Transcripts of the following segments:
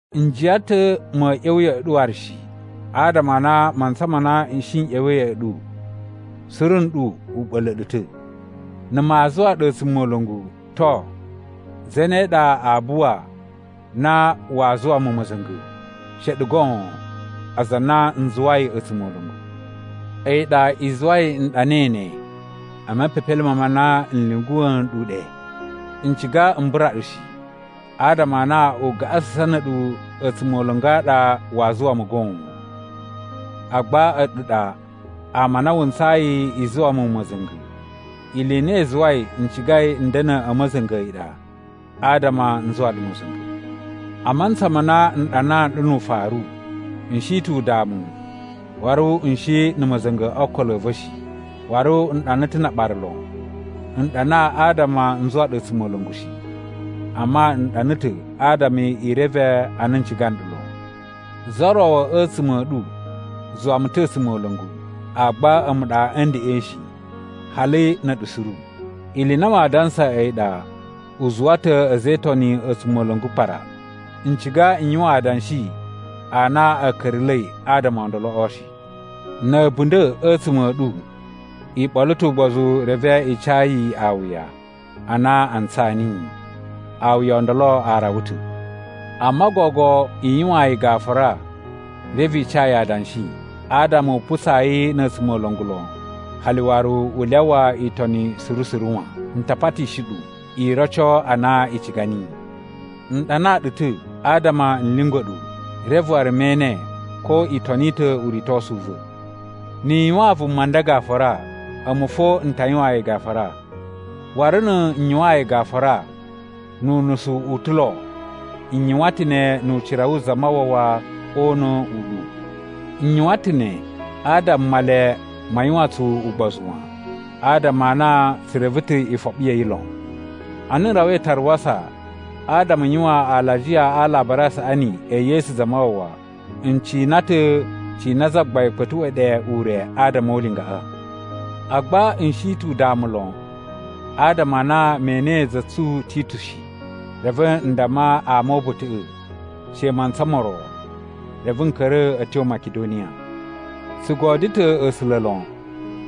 N jiyan ta̱ ma̱a̱ ꞌya̱wa̱ ya̱ꞌa̱ ɗu waru shi, adama a na mantsa ma na n shi n ꞌya̱wa̱i ya̱ꞌa̱ ɗu, suru nɗu u ɓa̱la̱ ɗu ta̱. Na̱ maa zuwa ɗu a̱tsumola̱ngu, to, zane ɗa aa buwa na waa zuwa mu ma̱za̱nga̱? She a̱ɗu goon, aza a na n zuwai a̱tsumola̱ngu. A̱yi ɗa i zuwai n ɗanai ne e mepepelime ma na n lyunguwa̱ nɗu ɗe. N ciga m bura ɗu shi, adama a na ugaꞌasusan na̱ a̱ɗu a̱tsumola̱ngu a ɗa waa zuwa mu goon. Agba a̱ɗu ɗa ama a na wu ntsayi i zuwa mu ma̱za̱nga̱. Ili i na i zuwai n cigai n da̱na̱ a̱ ma̱za̱nga̱ a̱yi ɗa adama n zuwa ɗu ma̱za̱nga̱. A mantsa ma na n ɗanaa nɗu nu ufaru, n shi ta̱ udamu waru n shi na̱ ma̱za̱nga̱ o okolo a̱ va̱ shi, waru n ɗana ta̱ na aɓara lon. N ɗana adama n zuwa ɗu a̱tsumola̱ngu shi, amma n ɗana ta̱ adama i reve a na n ciga nɗu lon. Za ro a̱tsuma̱ a̱ ɗu zuwa mu ta̱ a̱tsumola̱ngu, agba a̱mu ɗa a̱ ndeꞌen shi, hali na̱ a̱ɗu suru. Ili i na maa dansa a̱yi ɗa u zuwa ta̱ a̱za̱ e Itoni a̱tsumola̱ngu kpara. (N ciga n yuwan adanshi a na a̱ ka̱ra̱la̱i adama o ndoloꞌo shi.) Na̱ a̱bunda̱ a̱tsuma̱ a̱ ɗu i ɓolo ta̱ ugbozu reve i ca yi awuya a na a ntsaa niyi. Awuya o ndolo a rawa ta̱. Amma gogo i yuwaan yi gafura reve i ca yi adanshi adama u putsaa yi na̱ a̱tsumola̱ngu lon hali waru u lyawa itoni suru suru wan. N ta patishi ɗu, i roco a na i ciga niyi. N ɗanaa ɗu ta̱ adama n lyungwa̱ ɗu, reve waru me ene ko i toni ta̱ uritosu u va̱. Ni i yuwaan vuma nda gafura, a̱mu fo n ta yuwaan yi gafura. Waru na̱ n yuwaan yi gafura (nu unusu u ta̱ lo), n yuwan ta̱ ne nu ucira wu Zamawawa o una̱ u ɗu. N yuwan ta̱ ne adama Male ma yuwan tsu ugbozu wan, adama a na tsu reve ta̱ ifoɓi ya̱ yi lon. Ana n rawai Taruwasa adama n yuwan alajiya a Alabari a Saꞌani e Yesu Zamawawa, n cina ta̱ cina Zagbain kpa̱tuꞌwa̱ ɗe ure adama o ulingaꞌa. Agba n shi ta̱ udamu lon, adama a na me enei za tsu Titu shi. Reve n damma ama o uba̱ta̱ꞌa̱, “She mantsa mo ro,” reve n ka̱ra̱ a̱ tyo Makidoniya. Tsu godyo ta̱ A̱sula̱ lon!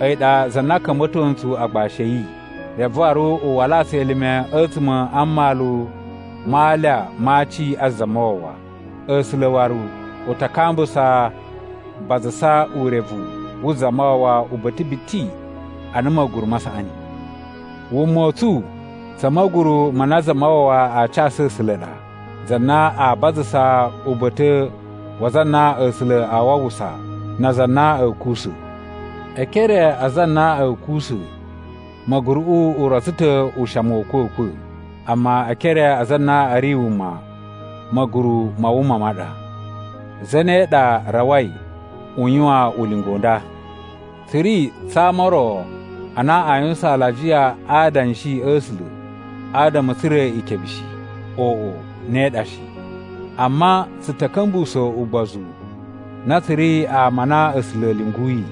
A̱yi ɗa za na ka̱mba̱to ntsu agbashi a̱ yi, reve waru u walaa tsu elime a̱tsuma̱ a mmalu ma alya ma aci a Zamawawa. A̱sula̱ waru u ta kambusa bazasa urevu wu Zamawawa uba̱ta̱ biti ana ma̱guru ma saꞌani. Wuma u tsu tsa̱ ma̱guru ma na Zamawawa a casu A̱sula̱ ɗa, za na a bazasa uba̱ta̱ wa aza a na A̱sula̱ a wawusa na aza a na a̱ kuwusa̱. E ekere a aza a na a̱ kuwusa̱, ma̱guruꞌu u rotso ta̱ ushamu wa̱ a̱kwa̱kwa̱, amma e ekere a aza a na a̱ ri wuma ma̱guru ma wuma ma ɗa. Zane ɗa rawai u yuwan ulinga u nda? Tsu ri tsa ama o ro a na a yuwusan alajiya a adanshi a̱ A̱sula̱ adama a̱ tsura̱ ikebe shi. Oꞌo, ne ɗa shi. Amma tsu ta̱ ka̱mbusa̱ ugbozu na tsu ri ama a na A̱sula̱ a̱ lyunguyi,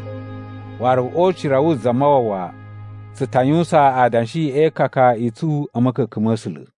waru o ucira wu Zamawawa tsu ta yuwusan adanshi e ikaka i tsu a̱ ma̱ka̱ka̱n ma̱ A̱sula̱.